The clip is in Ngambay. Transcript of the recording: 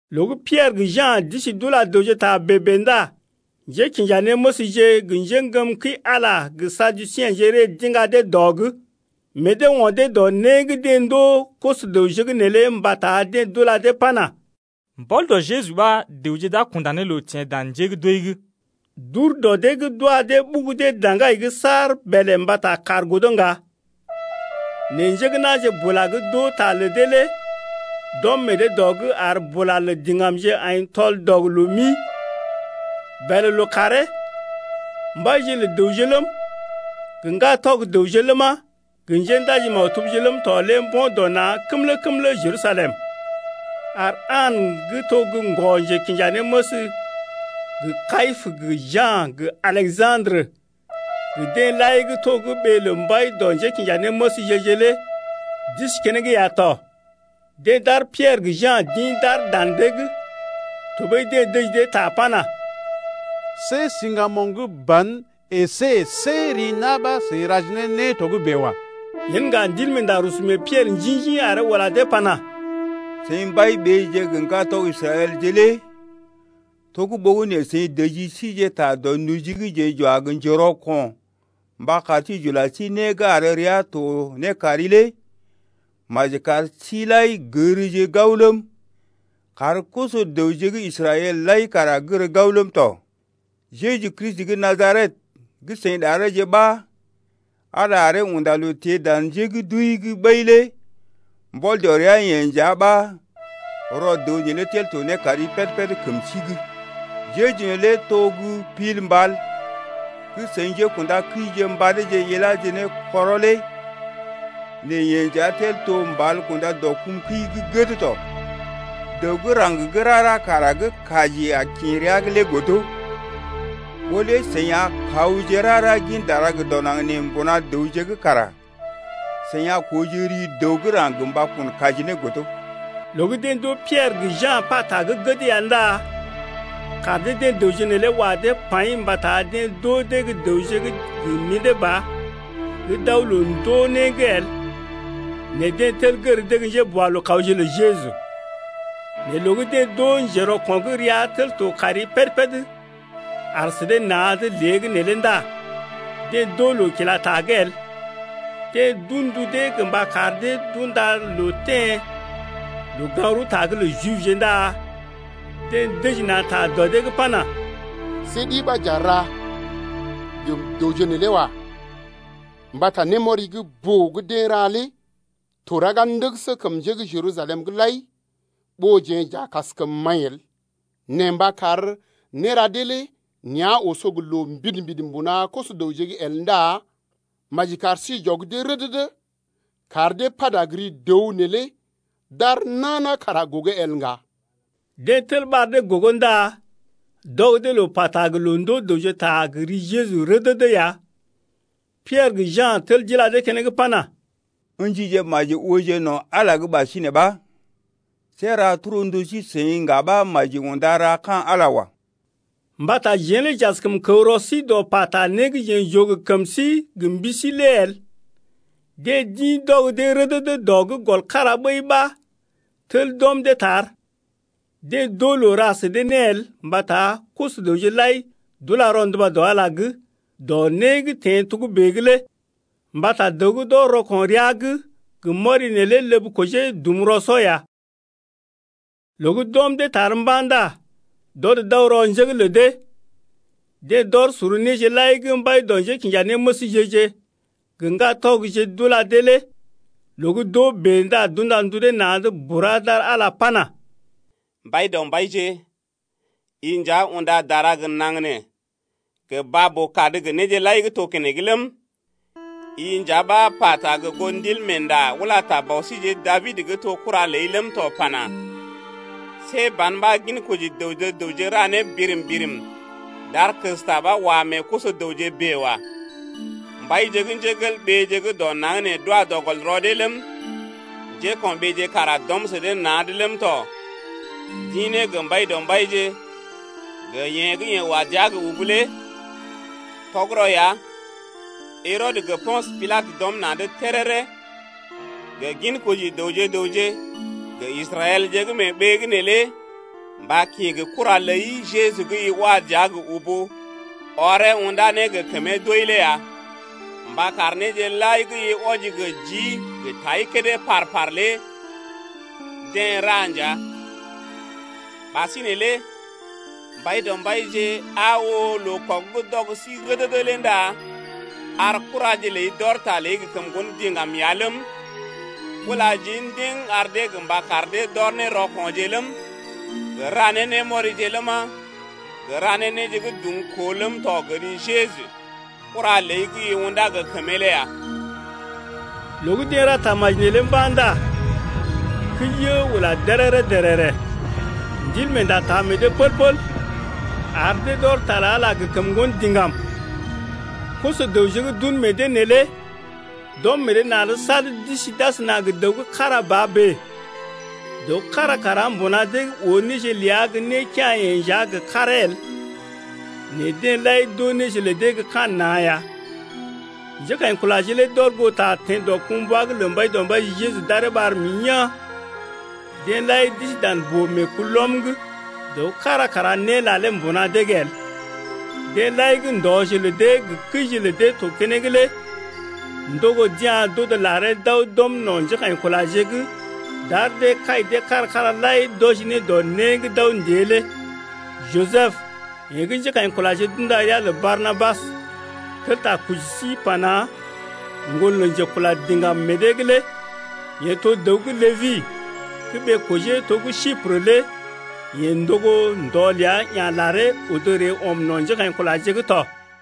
Loo gə́ Piɛrə gə Ja̰ d’isi d’ula dəwje ta bèe-bèe ndá njékinjanéməsje gə njeŋgəm kəi-Ala gə Saduseḛje ree d’iŋga dee dɔ’g. Meḛ dee o̰ dee dɔ né gə́ deḛ ndoo koso-dəwje’g neelé mbata deḛ d’ula dee pana: Mbɔl dɔ Jeju ɓa dəwje d’a kunda ne loo teḛ dan njé gə́ d’wəi’g. D’ur dɔ dee’g d’wa dee ɓugu dee daŋgai’g saar bèlè mbata kàr godo ŋga. Nɛ njé gə́ na̰je bula gə́ d’oo ta lə dee lé d’ɔm meḛ dee dɔ’g ar bula lə diŋgamje aḭ tɔl-dɔg-loo-mi. Bèlè lookàree mbaije lə dəwje ləm, gə ŋgatɔg dəwje ləma, gə njéndaji-maktubje ləm tɔ lé mbo̰ na̰ kəmlə-kəmlə Jerusalem ar An gə́ to gə́ ŋgɔ-njekinjanéməs gə Kayipə gə Ja̰ gə Aleja̰drə gə deḛ lai gə́ to gə́ ɓee lə mbai dɔ njékinjanéməsje-je lé d’isi keneŋ ya tɔ. Deḛ d’ar Piɛrə gə Ja̰ d’ḭ d’aar dan dee’g, tɔɓəi deḛ dəji dee ta pana: See siŋgamoŋ gə́ ban əsé see ri na̰ ɓa seḭ raje ne né togə́bè wa. Yen ŋga Ndilmeenda rusu mee Piɛrə njḭ-njḭ aree ula dee pana: Seḭ mbai-ɓeeje gə ŋgatɔg Israɛlje lé to gə́ ɓogənè seḭ dəji síje ta dɔ noji gə́ jeḛ j’wa gə njerɔko̰ mba kar sí j’ula sí né gə́ ar rəa to ne kari lé maji kar sí-seḭ lai gərje gao ləm, kar koso-dəwje gə́ Israɛl lai kara gər gao ləm tɔ. Jeju Kristi gə́ Najaret gə́ seḭ ɗareeje ɓa Ala aree unda loo teḛ dan njé gə́ d’wəi’g ɓəi lé mbɔl dɔ ria-yeḛ nja ɓa rɔ dəw neelé tel to ne kari péd-péd kəm sí’g. Jeju neelé to gə́ Pil mbal gə́ seḭ njékṵdakəije mbadeeje iláje ne kɔrɔ lé. Nɛ yee nja tel to mbal kunda dɔ kum kəi gə́ gəd tɔ. Dəw gə́ raŋg rara kara gə́ kaji a kḭ rəa’g lé godo. Ɓó lé seḭ a kawje rara gin dara gə dɔ naŋg nee mbuna dəwje’g kara seḭ a kooje ri dəw gə́ raŋg gə mba kun kaji ne lé el. Loo gə́ deḛ d’oo Piɛrə gə Ja̰ pata gə́ gəd ya ndá kaar dee-deḛ dəwje neelé wa dee paḭ mbata deḛ d’oo dee gə́ dəwje gə́ mḭdé ba gə́ d’aw loo-ndoo-né’g el, nɛ deḛ tel gər dee gə́ njéboalookawje lə Jeju tɔ. Nɛ loo gə́ deḛ d’oo njerɔko̰ gə́ rəa tel to kari péd-péd aar sə dee na̰’d lée’g neelé ndá deḛ d’oo loo kila ta’g el. Deḛ d’un ndu dee gə mba kar dee d’unda loo teḛ loo-gaŋg-rəwta’g lə Jibje ndá deḛ dəji na̰ ta dɔ dee’g pana: See ɗi ɓa j’a ra gə dəwje neelé wa. Mbata némɔri gə́ boo gə́ deḛ ra lé to raga ndəgəsə kəm njé gə́ Jerusalem’g lai ɓó jeḛ j’a kaskəm maḭ el. Nɛ mba kar néra dee lé nea̰ oso gə loo mbidi-mbidi mbuna koso-dəwje’g el ndá maji kar sí j’ɔg dee rədədə kar dee pata gə ri dəw neelé d’ar nana kara gogo el ŋga. Deḛ tel ɓar dee gogo ndá d’ɔg dee loo pata gə loo ndoo dəwje ta gə́ ri Jeju rədədə ya. Piɛrə gə Ja̰ tel d’ila dee keneŋ pana: Ǝ̰jije maji ooje no̰ Ala’g ɓasinè ɓa, see ra torndu sí-seḭ ŋga ɓa maji unda ra ka̰ Ala wa. Mbata jeḛ lé j’askəm kəw rɔ sí dɔ pata né gə́ jeḛ j’oo gə kəm sí gə mbi sí lé el. Deḛ d’ḭ d’ɔg dee rədədə dɔ’g gɔl kára ɓəi ɓa tel d’ɔm dee tar, deḛ d’oo loo ra sə dee né el mbata koso-dəwje lai d’ula rɔnduba dɔ Ala’g wɔji dɔ né gə́ teḛ togə́bè’g lé. Mbata dəw gə́ d’ɔr rɔko̰ rəa’g gə mɔri neelé ləb kojee dum rɔ-sɔ ya. Loo gə́ d’ɔm dee tar mba̰ ndá d’ɔd d’aw rɔ njé’g lə dee, deḛ d’ɔr sor néje lai gə́ mbai dɔ njékinjanéməsje-je gə ŋgatɔgje d’ula dee lé. Loo gə́ d’oo bèe ndá d’unda ndu dee na̰’d bura d’ar Ala pana: Mbaidɔmbaije, i nja unda dara gə naŋg nee gə baa-boo-kad gə néje lai gə́ to keneŋ ləm 5i nja ɓa pata gə goo Ndilmeenda ula ta bɔ síjeḛ Dabid gə́ to kura ləi ləm tɔ pana: See ban ɓa ginkoji dəwje gə raŋg ra né birim-birim D’ar kəsta ɓa wa meḛ koso-dəwje bèe wa. Mbaije gə́ dɔ naŋg nee d’wa dɔ gɔl rɔ dee ləm, Njéko̰ɓeeje kara d’ɔm sə dee na̰’d ləm tɔ D’ḭ ne gə Mbaidɔmbaije gə yeḛ gə́ wa dəa gə ubu lé. Tɔgərɔ ya Herɔdə gə Po̰sə Pilatə d’ɔm na̰’d téréré gə ginkoji dəwje gə raŋg gə Israɛlje gə́ mee ɓee’g neelé mba kḭ gə kura ləi Jeju gə́ i wa dəa gə ubu ɔree unda ne gə kəmee doi lé ya mba kar néje lai gə́ i wɔji gə jii gə tai kédé par-par lé deḛ ra nja. Ɓasinè lé Mbaidɔmbaije, aa oo, loo kɔg gə́ d’ɔg sí rədədə lé ndá ar kuraje ləi d’ɔr ta ləi gə kəm ŋgon diŋgam ya ləm, ula jii ndiŋ ar dee gə mba kar dee d’ɔr ne rɔko̰je ləm, gə ra ne némɔrije ləma, gə ra ne néje gə́ dumkoo ləm tɔ gə ri Jeju, kura ləi gə́ i undá gə kəmee lé ya. Loo gə́ deḛ ra tamaji neelé mba̰ ndá kəi yə ula déréré-dèrèrè. Ndilmeenda taa meḛ dee pəl-pəl, ar dee d’ɔr ta lə Ala gə kəm ŋgon diŋgam tɔ. Koso-dəwje gə́ d’un meḛ dee neelé d’ɔm meḛ dee na̰’d sad d’isi d’asəna gə dəw gə́ kára ba bèe. Dəw kára kara mbuna dee’g oo néje ləa gə́ né kea̰-yeḛ nja gə karee el, nɛ deḛ lai d’oo néje lə dee gə́ ka̰ na̰ ya. Njékaḭkulaje lé d’ɔr goo ta teḛ dɔkumbwa’g lə Mbaidɔmbaije Jeju d’aree ɓar mḭ yaa̰. Deḛ lai d’isi dan boo-meekulɔm’g. Dəw kára kara né lalee mbuna dee’g el, deḛ lai gə́ ndɔje lə dee gə kəije lə dee to keneŋ lé ndogo d’ya̰ d’odo laree d’aw d’ɔm no̰ njékaḭkulaje’g d’ar dee kai dee kára-kára lai d’wɔji ne dɔ né gə́ d’aw ndée lé. Jisəb, yeḛ gə́ njékaḭkulaje d’unda ria lə Barnabas (tel ta koji sí pana: Ŋgon lə njekula diŋgam meḛ dee’g lé) yeḛ to dəw gə́ Lébi gə́ ɓee-kojee to gə́ Siprə lé yeḛ ndogo ndɔ ləa ya̰ laree odo ree ɔm no̰ njékaḭkulaje’g tɔ.